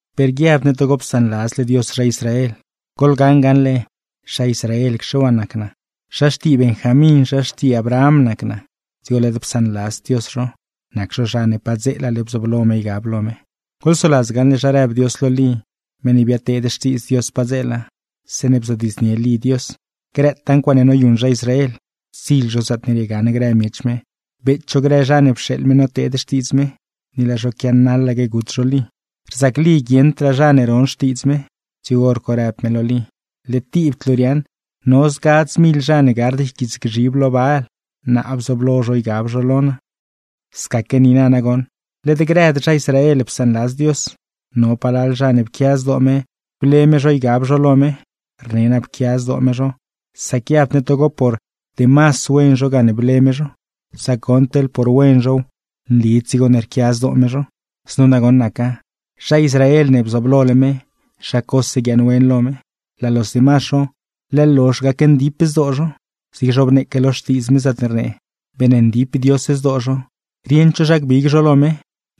Per guiabd ne togo psaanladzle Dios zha Israel. Goḻgaṉ gaṉle, zha Israelacxe waa nac naa, zha xtii Benjamín, zha xtii Abraham nac naa; dzigo led psaanladzd Dios zho (nac zho zha ne padzeelale bzooblo me ygab lo me). Goḻsoladz gaṉle, zha rëb Dios lo Lí, meṉ ne biadteed xtiidz Dios padzeela, zeeṉe bzodiidznie Lí Dios grëtaa ncuaaṉe noyuṉ zha Israel, ptsiḻ zho zaatne riegaṉ grë miech me, beet zho grë zha ne pxeeḻ me noteed xtiidz me, ni laa zho quianaḻaque gut zho Lí. Rzac Lí guieṉdraa zha ne ron xtiidz me, dzigo hor co rëb me lo Lí: “Led tibd luu riaaṉ, no zgadz mil zha ne gard yquiitsgzhib lo Baal, naa bzooblo zho ygab zho lo naa.” Scaquegaa niina nagoṉ led grëd zha Israel psaanladz Dios, no palal zha ne pquia zdoo me ble me zho ygab zho lo me. Rne naa pquia zdoo me zho, sac guiabd ne togo por demas wen zho gane ble me zho; sac goṉ, teḻ por wen zhow, nlid dzigo ne rquia zdoo me zho. Znu nagoṉ naca: Zha Israel ne bzooblole me, zha cose guiaaṉwen lo me. Laa los demas zho, leḻ lozh gacndip zdoo zho, zigne zhobneeque lo Xtiidz me, zaatne rnee: “Beeṉndip Dios zdoo zho, rieṉd zho zha gbig zho lo me;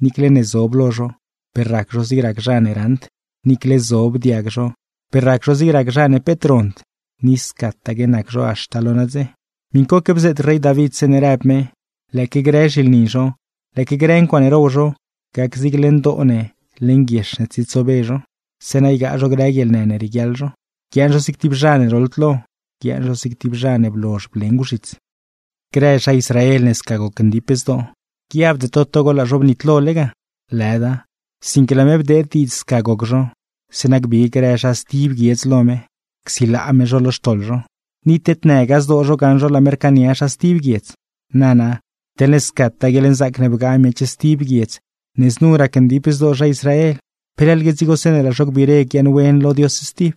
niicle ne zob lo zho, per rac zho zig rac zha ne raṉd; niicle zob diag zho, per rac zho zig rac zha ne peet rond. Ni scataque nac zho haxta lo nadze.” Miṉcoque bzeet rey David, zeeṉe rëb me: Lëëque grë zhilni zho, lëëque grë ncuaaṉe row zho, gac zig leṉ doo ne, leṉ guiex ne tsietsobe zho; zeeṉa ygaa zho guieḻnë ne rieguiaḻ zho. Guiaaṉ zho zig tib zha ne roḻd lo, guiaaṉ zho zig tib zha ne blozh blengw zhits. Grë zha Israel ne sca gocndip zdoo, guiabde to togo laa zho bnitlole ga. ¡Lëda! Sinque laa me bdeed diidz sca goc zho, zeeṉa gbig grë zha stib guiedz lo me csilaa me zho lo xtoḻ zho; ni tednëgaa zdoo zho gaṉ zho laa me rcaania zha stib guiedz. Nana, teḻne scataa guieḻnzaac ne bgaa miech stib guiedz ne znu racndip zdoo zha Israel, ¿pe leḻgue dzigo zeeṉe laa zho gbiire guiaaṉwen lo Dios stib?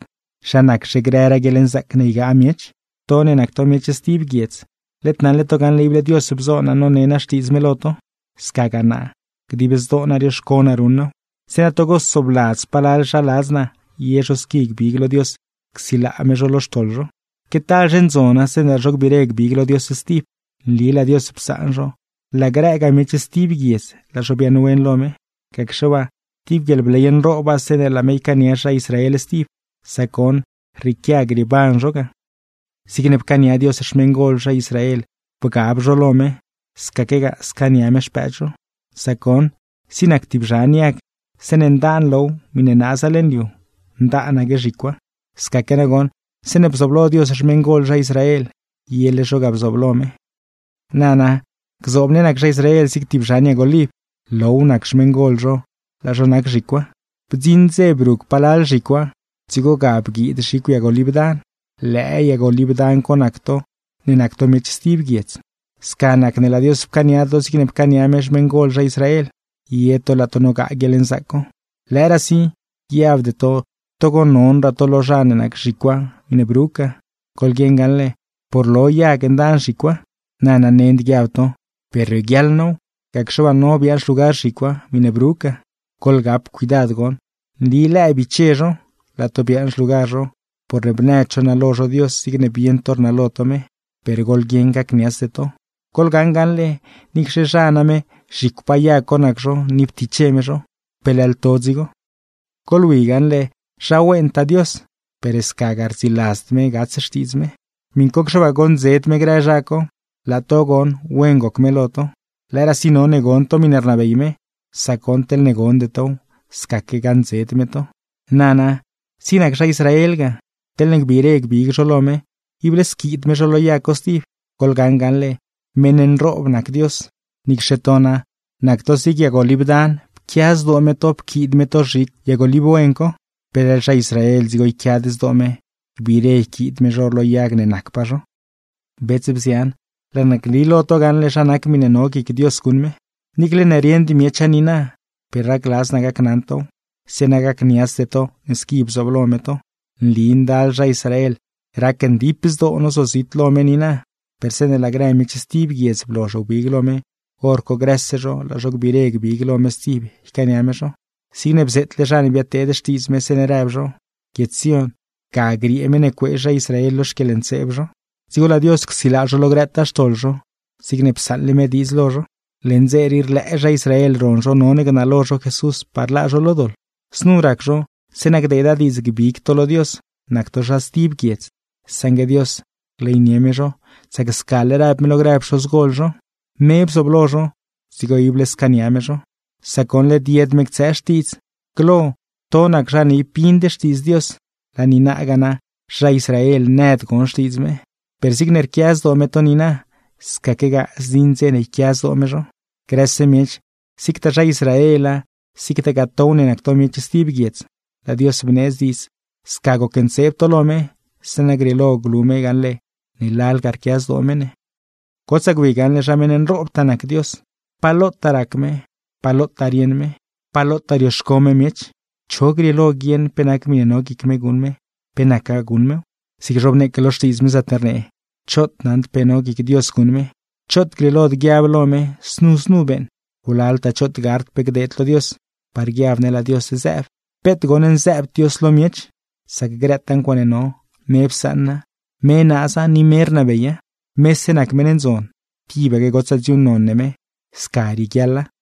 ¡Zha naczhe grëraa guieḻnzaac ne ygaa miech! To ne nac to miech stib guiedz, led naṉle to gaṉle, ible Dios bzo naa none naa Xtiidz me lo to. Scagaa naa, dib zdoo naa rioxco naa ruṉ naaw, zeeṉa togo soobladz palal zha ladz naa ye zho squi gbig lo Dios csilaa me zho lo xtoḻ zho. ¡Que talzhe ndzona zeeṉe laa zho gbiire gbig lo Dios stib! Nli laa Dios psaan zho, laa grëgaa miech stib guiedz laa zho biaaṉwen lo me. Gacxe waa, ¡tib guieḻbley nrooba zeeṉe laa me ycaania zha Israel stib! Sac goṉ, rrieequia grieeban zho ga. Zigne pcaania Dios xmeṉgol zha Israel bgab zho lo me, scaquegaa scaania me xpëëd zho; sac goṉ, zig nac tib zhan yag, zeeṉe ndaan low miṉe naaza leṉ liu, ndaanaque zhicwa. Scaque nagoṉ, zeeṉe bzooblo Dios xmeṉgol zha Israel, yele zho ga bzooblo me. Nana, gzoob ne nac zha Israel zig tib zhan yag oliv: low nac xmeṉgol zho, laa zho nac zhicwa. Bdziṉ dze brug palal zhicwa, dzigo ga bguiid zhicw yag oliv dan; lëë yag oliv dan co nac to ne nac to miech stib guiedz. Sca nac ne laa Dios pcaania to zigne pcaania me xmeṉgol zha Israel; ye to laa to nogaa guieḻnzaac co. Lëëraasi, guiabde to togo nonraa to lo zha ne nac zhicwa miṉe brug ga. Goḻguieṉ gaṉle, por lo yag ndaan zhicwa. Nana, nend guiab to: “Per rioguiaḻ now, gacxe waa no biaaṉ xlugar zhicwa, miṉe brug ga.” ¡Goḻgap cuidad goṉ! Nli lëë biche zho, laa to biaaṉ xlugar zho, porne bnëd zho nalo zho Dios zigne bieṉ to rnalo to me; per goḻguieṉ gacniatsde to. Goḻgaṉ gaṉle, niicxe zha name zhicwpaa yag co nac zho ni ptiche me zho, ¡peleḻ to dzigo! Goḻwi gaṉle zha wentaa Dios, per scagaa rdziladzd me gats xtiidz me. Miṉcocxe waa goṉdzed me grë zha co, laa to goṉ wen goc me lo to. Lëëraasi none gon to miṉe rnabey me, sac goṉ teḻne gonde tow, scaque gaṉdzed me to. Nana, zig nac zha Israel ga, teḻne gbiire gbig zho lo me, ible squiid me zho lo yag co stib. ¡Goḻgaṉ gaṉle meṉ nroob nac Dios! Niicxe to na, nac to zig yag oliv dan, pquia zdoo me to pquiid me to zhicw yag oliv wen co, ¡peleḻ zha Israel dzigo yquiad zdoo me, gbiire yquiid me zho lo yag ne nacpaa zho! Bets, bzian, laa naa gni lo to gaṉle zha nac miṉe no guic Dios guṉ me. Niicle ne rieṉd miecha niina, per racladz naa gacnaṉ tow, zeeṉa gacniatsde to ne squi bzooblo me to: Nli ndal zha Israel racndip zdoo zozit zho lo me niina, per zeeṉe laa grë miech stib guiedz blozh wbig lo me, hor co grëse zho, laa zho gbiire gbig lo me stib ycaania me zho. Zigne bzeetle zha ne biadteed xtiidz me, zeeṉe rëb zho: Guiedz Sión, ga griee meṉ ne cuee zha Israel lo xquieḻntseeb zho. Dzigo laa Dios csilaa zho lo grëtaa xtoḻ zho, zigne psaṉle me diidz lo zho. Leṉ dze rii rlëë zha Israel ron zho none gnalo zho Jesús, par laa zho lo doḻ. Znu rac zho zeeṉa gdeeda diidz gbig to lo Dios, nac to zha stib guiedz; saṉgue Dios rleynie me zho, sac scale rëb me lo grë pxozgol zho. Me bzooblo zho, dzigo ible scaania me zho; sac goṉ, led yed me ctsëë xtiidz. Glo to nac zha ne ib bind xtiidz Dios, laa niinagaa na zha Israel nëd gon xtiidz me. Per zigne rquia zdoo me to niina, scaquegaa zdziṉ dze ne yquia zdoo me zho. Grëse miech, zigtaa zha Israela, zigtagaa tow ne nac to miech stib guiedza, laa Dios bneedz diidz sca gocntseeb to lo me, zeeṉa grieelo glu me gaṉle ne lalga rquia zdoo me ne. ¡Gotsaa gwi gaṉle zha meṉ nroobtaa nac Dios! ¡Pa lotaa rac me, pa lotaa rieṉ me! ¡Pa lotaa rioxco me miech! ¿Cho grieelo guieṉ pe nac miṉe no guic me guṉ me, pe nacgaa guṉ mew? Zigne zhobneeque lo Xtiidz me, zaatne rnee: “¡Choot naṉd pe no guic Dios guṉ me! ¡Choot grieelod guiab lo me, znu znu beeṉ! Wlaltaa choot gard pe gdeed lo Dios, par guiab ne laa Dios zëëb.” ¡Peet goṉ nzëëbd Dios lo miech! Sac grëtaa ncuaaṉe no, me psaṉa, me naaza, ni me rnabeya. ¡Mese nac meṉ ndzon, tibaque gotsaa dziuuṉnon ne me! Sca rieguiaḻa.